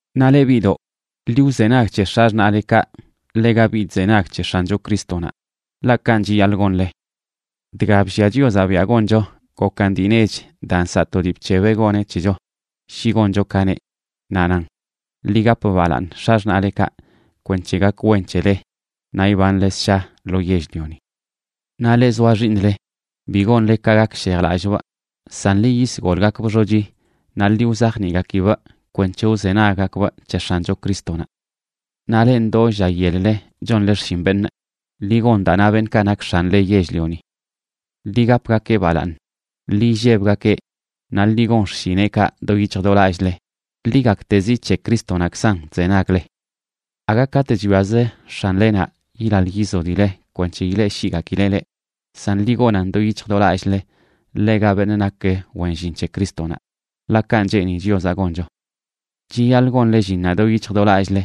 Naꞌ leꞌ biꞌdoꞌ, ḻi wzenag c̱he x̱axṉaꞌlekaꞌ ḻega biꞌ chzenag c̱he X̱ancho Crístonaꞌ, ḻaꞌ kanꞌ chiyaḻꞌ gonle. Dga bllia Chiozaꞌ biaꞌ goncho gokan dii nech daa nsaꞌ to dii bc̱hebeꞌ goneꞌ c̱hecho shi goncho ka neꞌ, naꞌ nan: “Ḻi gap balaaṉ x̱axṉaꞌlekaꞌ, kwenc̱he gak wen c̱hele naꞌ ibanle ssha lo yell-lioni.” Naꞌ leꞌ zoa xiiṉle, bi gonle ka gakshejlallꞌbꞌ, san ḻi yisgolgakbꞌ xochi naꞌ ḻi wzajniꞌgakibꞌ kwenc̱he wzenaggakbꞌ c̱he X̱ancho Crístonaꞌ. Naꞌ leꞌ ndoo lla yel-le chonle xshin beṉꞌ, ḻi gon daa na beṉꞌkaꞌ nak x̱anle yell-lioni. Ḻi gapgakeꞌ balaaṉ, ḻi illebgakeꞌ naꞌ ḻi gon xshineꞌkaꞌ do yic̱hj do lallꞌle. Ḻi gaktezi c̱he Crístonaꞌkzan chzenagle. Aga katꞌ chwiazə x̱anlenaꞌ yilaḻ yizodileꞌ kwenc̱he ileꞌshiꞌgakileꞌ leꞌ, san ḻi gonan do yic̱hj do lallꞌle ḻega beṉꞌ nak wen llin c̱he Crístonaꞌ, ḻaꞌ kanꞌ cheeni Chiozaꞌ goncho. Chiyaḻꞌ gonle llinnaꞌ do yic̱hj do lallꞌle,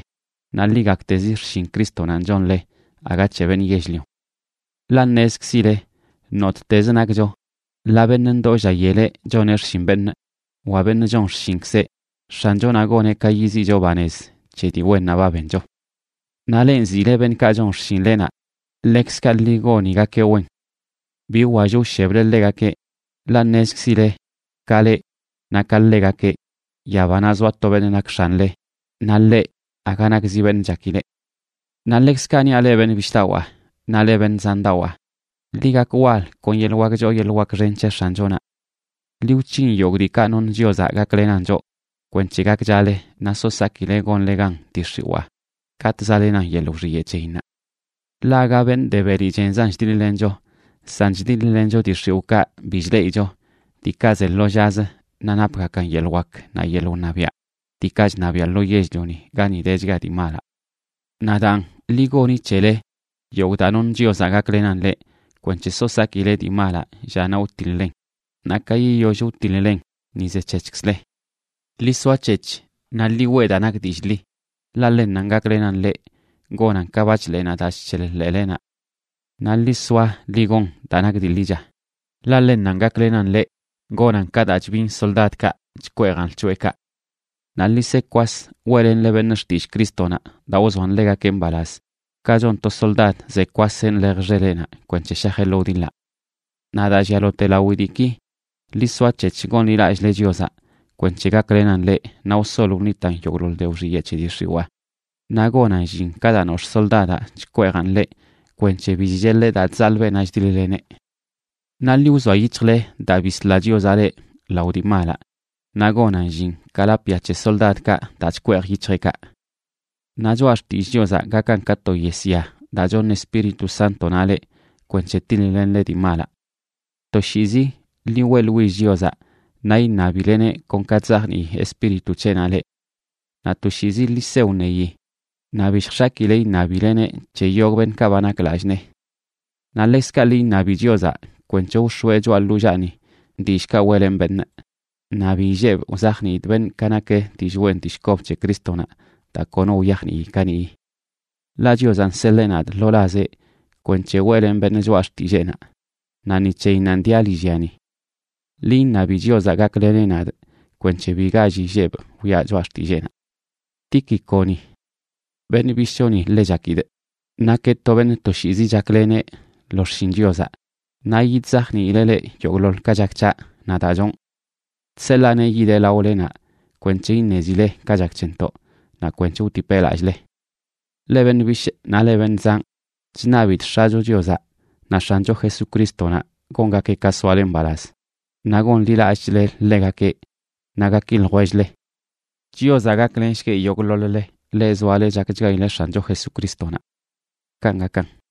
naꞌ ḻi gaktezi xshin Crístonanꞌ chonle, aga c̱he beṉꞌ yell-lion. Ḻaꞌ ṉezkzile nottezə nakcho, ḻaa beṉꞌ ndoo lla yeleꞌ choneꞌ xshin beṉꞌ wa beṉꞌ chon xshinkzeꞌ, X̱anchonaꞌ goneꞌ ka yiziꞌcho banez c̱he dii wennaꞌ ba bencho. Naꞌ leꞌ nziꞌle beṉꞌkaꞌ chon xshinlenaꞌ, ḻekzkaꞌ ḻi gonigakeꞌ wen. Bi wwall wsheble ḻegakeꞌ, ḻaꞌ ṉezkzile, ka leꞌ naꞌ ka ḻegakeꞌ, yabanaꞌ zoa to beṉꞌ nak X̱anle, naꞌ ḻeꞌ aga nakzi beṉꞌ chakileꞌ. Naꞌ ḻekzkaꞌ niaꞌ leꞌ beṉꞌ bishꞌdawaa naꞌ leꞌ beṉꞌ zandawaa, ḻi gak wal kon yeḻꞌ wak choo yeḻꞌ wak xen c̱he X̱anchonaꞌ. Ḻi wc̱hin yogꞌ diikaꞌ noṉ Chiozaꞌ gaklenan choꞌ kwenc̱he gakchale naꞌ so sakile gonle gan dii x̱iwaa katꞌ zaꞌlenan yeḻꞌ wxiyeꞌ c̱heyinnaꞌ. Ḻaꞌ aga beṉꞌ de beli chenzan chdiḻ-lencho, san chdiḻ-lencho dii x̱iwꞌkaꞌ bi chleꞌicho, diikaꞌ ze lo llazə naꞌ napgakan yeḻꞌ wak naꞌ yeḻꞌ wṉabiaꞌ, diikaꞌ chṉabiaꞌ lo yell-lioni gani dechga dii malaꞌ. Naꞌ daan, ḻi goni c̱hele yogꞌ daa noṉ Chiozaꞌ gaklenan leꞌ kwenc̱he so sakile dii malaꞌ llaꞌnaꞌ wtiḻ-len, naꞌ ka yiyoll wtiḻ-len ni zec̱hec̱hkzle. Ḻi soac̱hec̱h naꞌ ḻi weꞌ daa nak dillꞌ ḻi, ḻaꞌ ḻennanꞌ gaklenan leꞌ gonan ka bachḻeenaꞌ daa chc̱heḻ ḻeelenaꞌ. Naꞌ ḻi soa ḻi gon daa nak dii ḻicha, ḻaꞌ ḻennanꞌ gaklenan leꞌ gonan ka daa chbin soldadkaꞌ chkweejan lc̱hoꞌekaꞌ. Naꞌ ḻi se kwas weꞌlenle beṉꞌ xtillꞌ Crístonaꞌ daa wzoan ḻegakeꞌ mbalaz, ka chon to soldad zeꞌ kwaseꞌ nḻej xeleꞌnaꞌ kwenc̱he shajeꞌ lo wdiḻaꞌ. Naꞌ daa llialote lawi diiki, ḻi soac̱hec̱h gonḻilallꞌle Chiozaꞌ kwenc̱he gaklenan leꞌ naꞌ wsol wṉitan yogꞌḻoḻ de wxiyeꞌ c̱he dii x̱iwaa, naꞌ gonan llin ka daa nox̱ꞌ soldadaꞌ chkweejan ḻeꞌ kwenc̱he bi chcheḻeꞌ daa chzaḻꞌ beenaꞌ chdiḻ-leneꞌ. Naꞌ ḻi wzoa yic̱hjle daa bisla Chiozaꞌ leꞌ lao dii malaꞌ, naꞌ gonan llin ka lapꞌ ya c̱he soldadkaꞌ daa chkweej yic̱hjeꞌkaꞌ. Naꞌ Choꞌa Xtillꞌ Chiozaꞌ gakan ka to yesya daa choṉ Espíritu Sántonaꞌ leꞌ kwenc̱he tiḻ-lenle dii malaꞌ. Toshiizi ḻi weꞌḻwill Chiozaꞌ, naꞌ iṉabileneꞌ kon ka chzajnii Espíritu c̱heꞌnaꞌ leꞌ. Naꞌ toshiizi ḻi se wṉeyi, naꞌ bi lljx̱akile iṉabileneꞌ c̱he yogꞌ beṉꞌkaꞌ ba nak lallꞌ nee. Naꞌ ḻekzkaꞌ ḻi iṉabi Chiozaꞌ kwenc̱he wx̱oeꞌ choꞌa ḻollaani dillꞌkaꞌ weꞌlenꞌ beṉꞌ, naꞌ bi illebꞌ wzajniidꞌ beṉꞌ ka nak dillꞌ wen dillꞌ kob c̱he Crístonaꞌ daa kono wyajnii kaniꞌyi. Ḻaꞌ Chiozaꞌ nseḻee nadꞌ lo lazeꞌ kwenc̱he weꞌlenꞌ beṉꞌ choꞌa xtilleenaꞌ, naꞌ ni c̱heyinnanꞌ diaꞌ lillyani. Ḻi iṉabi Chiozaꞌ gakleneꞌ nadꞌ kwenc̱he bi gall illebꞌ wiꞌa choꞌa xtilleenaꞌ. Tíquiconi, beṉꞌ bishꞌchoni ḻe chakidꞌ, nakeꞌ to beṉꞌ toshiizi chakleneꞌ lo xshin Chiozaꞌ, naꞌ yidzajniileꞌ leꞌ yogꞌḻoḻ ka chak c̱haꞌ naꞌ daa chonꞌ. Chseḻaaneꞌ yideꞌ laolenaꞌ kwenc̱he iṉezile ka chak c̱hentoꞌ, naꞌ kwenc̱he wtipeꞌ lallꞌle. Leꞌ beṉꞌ bishꞌ naꞌ leꞌ beṉꞌ zanꞌ, chṉabidꞌ X̱acho Chiozaꞌ naꞌ X̱ancho Jesucrístonaꞌ gongakeꞌ ka soale mbalaz, naꞌ gonḻilallꞌchle ḻegakeꞌ, naꞌ gaki ljwell-le. Chiozaꞌ gaklenshgueꞌ yogꞌḻoḻ-le, leꞌ zoale chakchgaileꞌ X̱ancho Jesucrístonaꞌ. Kanꞌ gakan.